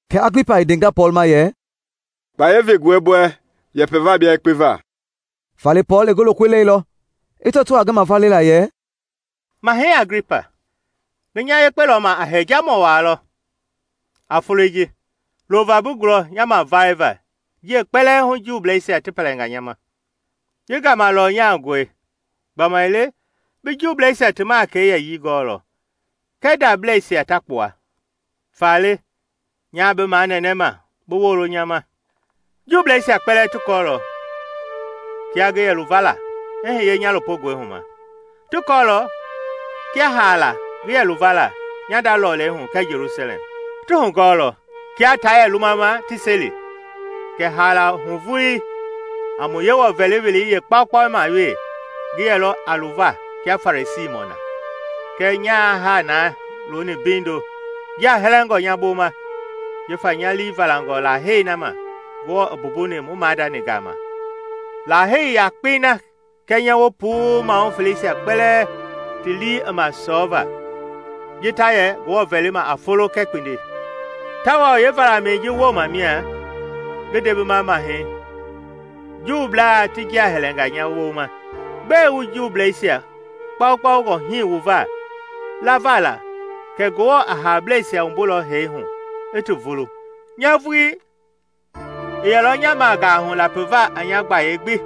Kɛ Aglipa i ndenga Pɔɔl ma yɛ, “Kpaya vengɔe bi wɛ yɛpɛ va bia yekpe va.” Faale Pɔɔl i ngi lokoi leilɔ i tɔto a ngi mavale la yɛ: “Mahɛi Aglipa, ngi nya yekpe lɔma a hɛjamɔ walɔ a foloi ji loova bi gulɔ nya mavale va jiei kpɛlɛɛ hu Juubleisia ti pɛlɛnga nya ma. Ji gama lɔnyangɔi gbamaile bi Juuisia ti makɛi yɛyii gɔɔlɔ kɛɛ ndableisia ta kpua. Faale, nyaa bi manɛnɛ bi wolo nya ma. “Juubleisia kpɛlɛɛ ti kɔɔlɔ kia ngi yɛluvala i hiye nya lopogɔihu ma. Ti kɔɔlɔ kia haala ngi yɛ luvala nya nda lɔlei hu kɛɛ Jelusalɛm. Ti hugɔɔlɔ, kiaa ta yɛlɔ lumama ti seli, kɛ haala hu vuii a mu Yewɔ vɛli welei yeekpaukpau ma we ngi yɛlɔ a luva kia Fariisimɔi na. Kɛɛ nya haa na looni mbeindo jia hɛlɛngɔ nya boma jifa nya lii valangɔ lahei na ma Ngewɔ i mbumbuni mu maadani gama lahei yakpei na kɛnyɛ wu puu mahu feleisia kpɛlɛɛ ti lii i ma sɔɔva, ji ta yɛ Ngewɔ vɛlima a folo kɛɛ kpindi. Tawao yeevalamɛi ji woma mia, ngi nde bima mahei, Juublaa ti jia hɛlɛnga nya boma! Gbɛe wu Juubleisia kpaukpaungɔ hii wu va lavala kɛ Ngewɔ a haableisia wumbulɔ hee hu i ti vulu?” “Nya vuii i yɛlɔ nya magahu lapiva a nya gbayei gbi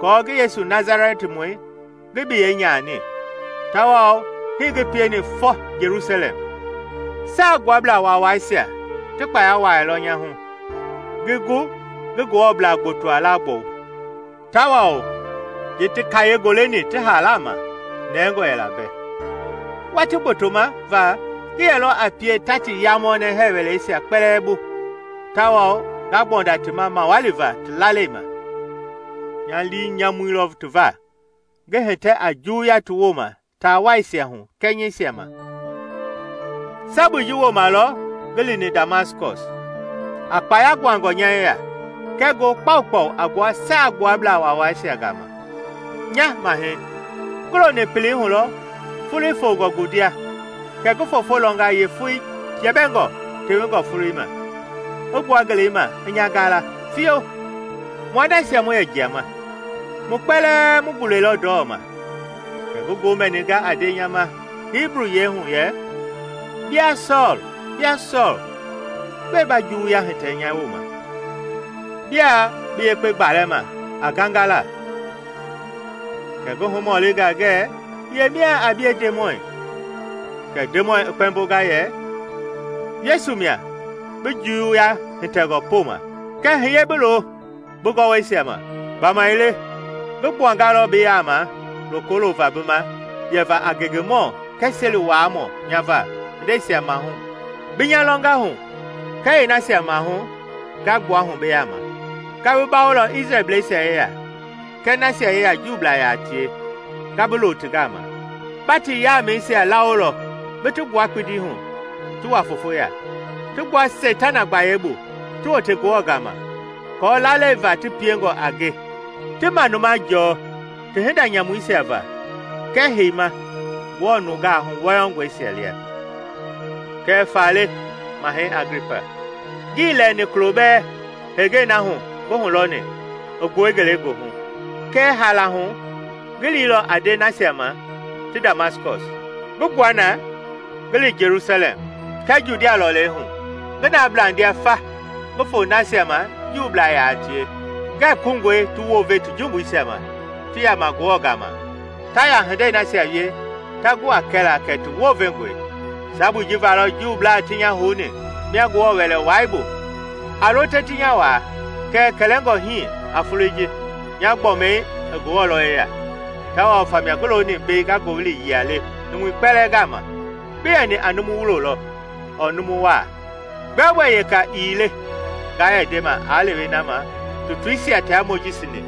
kɔɔ ngi Yesu Nasalɛtimɔi ngi biyɛi nyani. Tawao hii ngi pieni fɔ Jelusalɛm. Saagbuablaa Waawaisia ti kpaya wuailɔ nya hu ngi gu ngi Ngewɔblaa gbotoa laagbɔu; tawao ji ti kayee goleni ti haala ma, nɛngɔ yɛla mbɛ. Watii gbotoma va ngi yɛlɔ a pie ta ti yamɔnɛ hɛɛ wɛleisia kpɛlɛɛ bu tawao nga gbɔnda ti ma mawali va ti lalei ma. Nya lii nyamuilɔ ti va, ngi hitɛ a juwuya ti woma taawaisia hu kɛnyɛisia ma.” “Sabui ji woma lɔ ngi lini Damaskɔs a kpaya guangɔ nya yeya kɛɛ ngoo kpaukpau a gbua Saagbuablaa Waawaisia gama. Nya Mahɛi, ngi loni pelei hulɔ foloi fongɔ ngundia kɛ ngi foofo lɔnga yeefoi jɛbɛngɔ tewengɔ foloi ma i gbua ngelei ma i nya gaala fio mua nasia mu yɛ njiama. Mu kpɛlɛɛ mu gulɛilɔ ndɔma, kɛ ngi ngoo mɛninga a nde nya ma Hibu yiɛi hu yɛ, ‘Bia Sɔɔl, bia Sɔɔl, gbɛe ba juwuya hitɛ nya woma? Bia bi yekpe gbalɛ ma a ngangala.’ Kɛ ngi humɔlinga ngɛ, ‘Yemia a bie Ndemɔi?’ Kɛ Ndemɔi i kpɛmbonga yɛ, ‘Yesu mia, bi juwuya hitɛngɔ poma. Kɛɛ hiye bi loo bi gɔwɔisia ma; gbamaile ngi gbuangalɔ bi yama loko loova bi ma yɛva a ngengemɔ kɛɛ seli wuaamɔ nya va hindeisia maahu bi nya lɔnga hu kɛɛ yeenasia maahu nga gbuahu bi yaama. Nga bi bawolɔ Isrɛlbleisia yeya kɛɛ nasia yeya Juublaa yaa tie nga bi loo ti gama. Ba ti yamɛisia lawolɔ bi ti gbua kpindi hu ti wa fofo ya, ti gbua seitana gbayei bu ti wote Ngewɔ gama, aako lalei va ti piengɔ a nge ti manuma jɔɔ ti hinda nyamuisia va kɛɛ heima Ngewɔ nungaa huwɔyɔngɔisia lia.’” “Kɛ faale, Mahɛi Aglipa, ngii lɛɛni kulo bɛɛ heenge na hu ngi hulɔni i gbue ngelegoohu. Kɛɛ haala hu ngi liilɔ a nde nasia ma ti Damaskɔs, ngi gbua na ngi li Jelusalɛm kɛɛ Judia lɔlei hu, ngi na blandia fa ngi fo nasia ma Juublaa yaa tie, ngɛɛ koungɔe ti wounve ti jumbuisia ma ti yama Ngewɔ gama ta ya hindei nasia wie ta gu a kɛla kɛ ti wounvengɔe. Sabu ji valɔ Juublaa ti nya houni mia Ngewɔ Wɛlɛwai bu a lo te ti nya waa. Kɛɛ kɛlɛngɔ hii a foloi ji, nya gbɔmi i Ngewɔ lɔ yeya, tawao famia ngi looni mbei nga ngowili yia le numui kpɛlɛɛ gama, bi yɛni a numu wulo lɔ ɔɔ numu waa. Gbɛogbɛ yeka ii le nga yɛ ndema a lewe na ma tutuisia tia Mojisi ni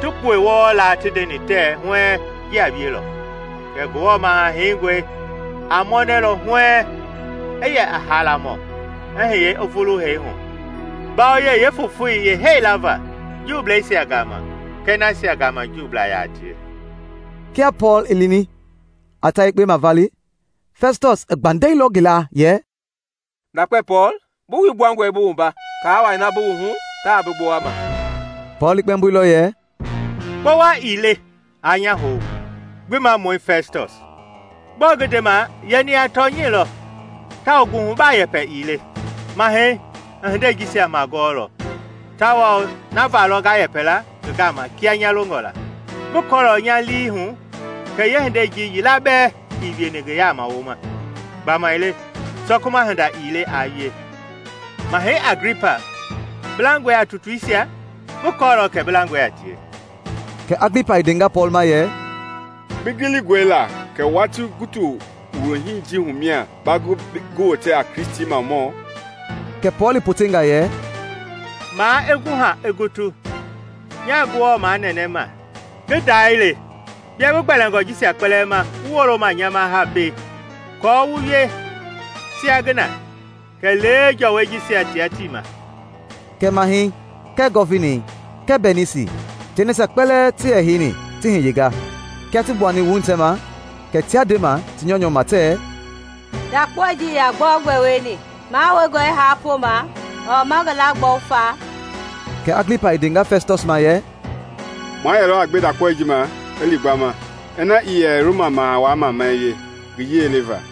ti kpue wɔɔ laa ti ndeni tɛɛ huɛɛŋ ji a wielɔ: kɛ Ngewɔ Maha-Heingɔi a mɔnɛlɔ huɛɛŋ i yɛ a haalamɔ i hiye i vulu hee hu mbawoyei yeefofoi yeehee la va Juubleisia gama kɛɛ nasia gama Juublaa yaa tie.” Kia Pɔɔl i lini a ta yekpe mavale, Fɛstɔs i gbandɛilɔ ngi laa yɛ, “Ndakpe Pɔɔl, bi wui gbuangɔi bi wumba! Kaa wai na bi wuhu ta bi gbowama!” Pɔɔl i kpɛmboilɔ yɛ, “Kpowa ii le aa nya hou, Gbimamɔi Fɛstɔs. Gbɔɔ ngi ndema yɛni a tɔnyɛi lɔ, tawao nguhubaa yɛpɛ ii le. Mahɛi i hinde jisia magɔɔlɔ, tawao na valɔ nga yɛpɛla ngi gama kia nya longɔ la. Ngi kɔɔlɔ nya lii hu kɛ yeehinde ji yila bɛɛ ii wieni ngi yaama woma, gbamaile sɔkuma hinda ii le a wie. Mahɛi Aglipa, bi langɔe a tutuisia? Ngi kɔɔlɔ kɛ bi langɔe a tie.” Kɛ Aglipa i ndenga Pɔɔl ma yɛ, “Bi gilingɔe la kɛ watii gutu wuloi ji hu mia ba gu ngi wote a Kristimamɔ?” Kɛ Pɔɔl i potenga yɛ, “Maa i guha i gutu, nya Ngewɔ manɛnɛ ma ngi dae le bia bi gbɛlingɔ jisia kpɛlɛɛ ma wu wolo ma haa nya ma mbei, kɔɔ wu wie sia ngi na, kɛlee jɔwɔi jisia tia tii ma!” Kɛ Mahɛi, kɛɛ Gɔvinei, kɛɛ Bɛnisi tia nasia kpɛlɛɛ ti yɛ heini ti hiyenga. Kia ti gbuani wuhitɛ ma, kɛ tia ndema ti nyɔunyɔu ma tɛ, “Ndakpaoi ji ii yaa gbɛogbɛ wieni mahoungɔ i haa poma ɔɔ ma ngi laagbɔu fa.” Kɛ Aglipa i ndenga Fɛstɔs ma yɛ, “Ma yɛlɔ a gbe ndakpaoi ji ma i li gbama ina ii yɛ Roma Maha Wai mamai wie ngi yiɛi le va.”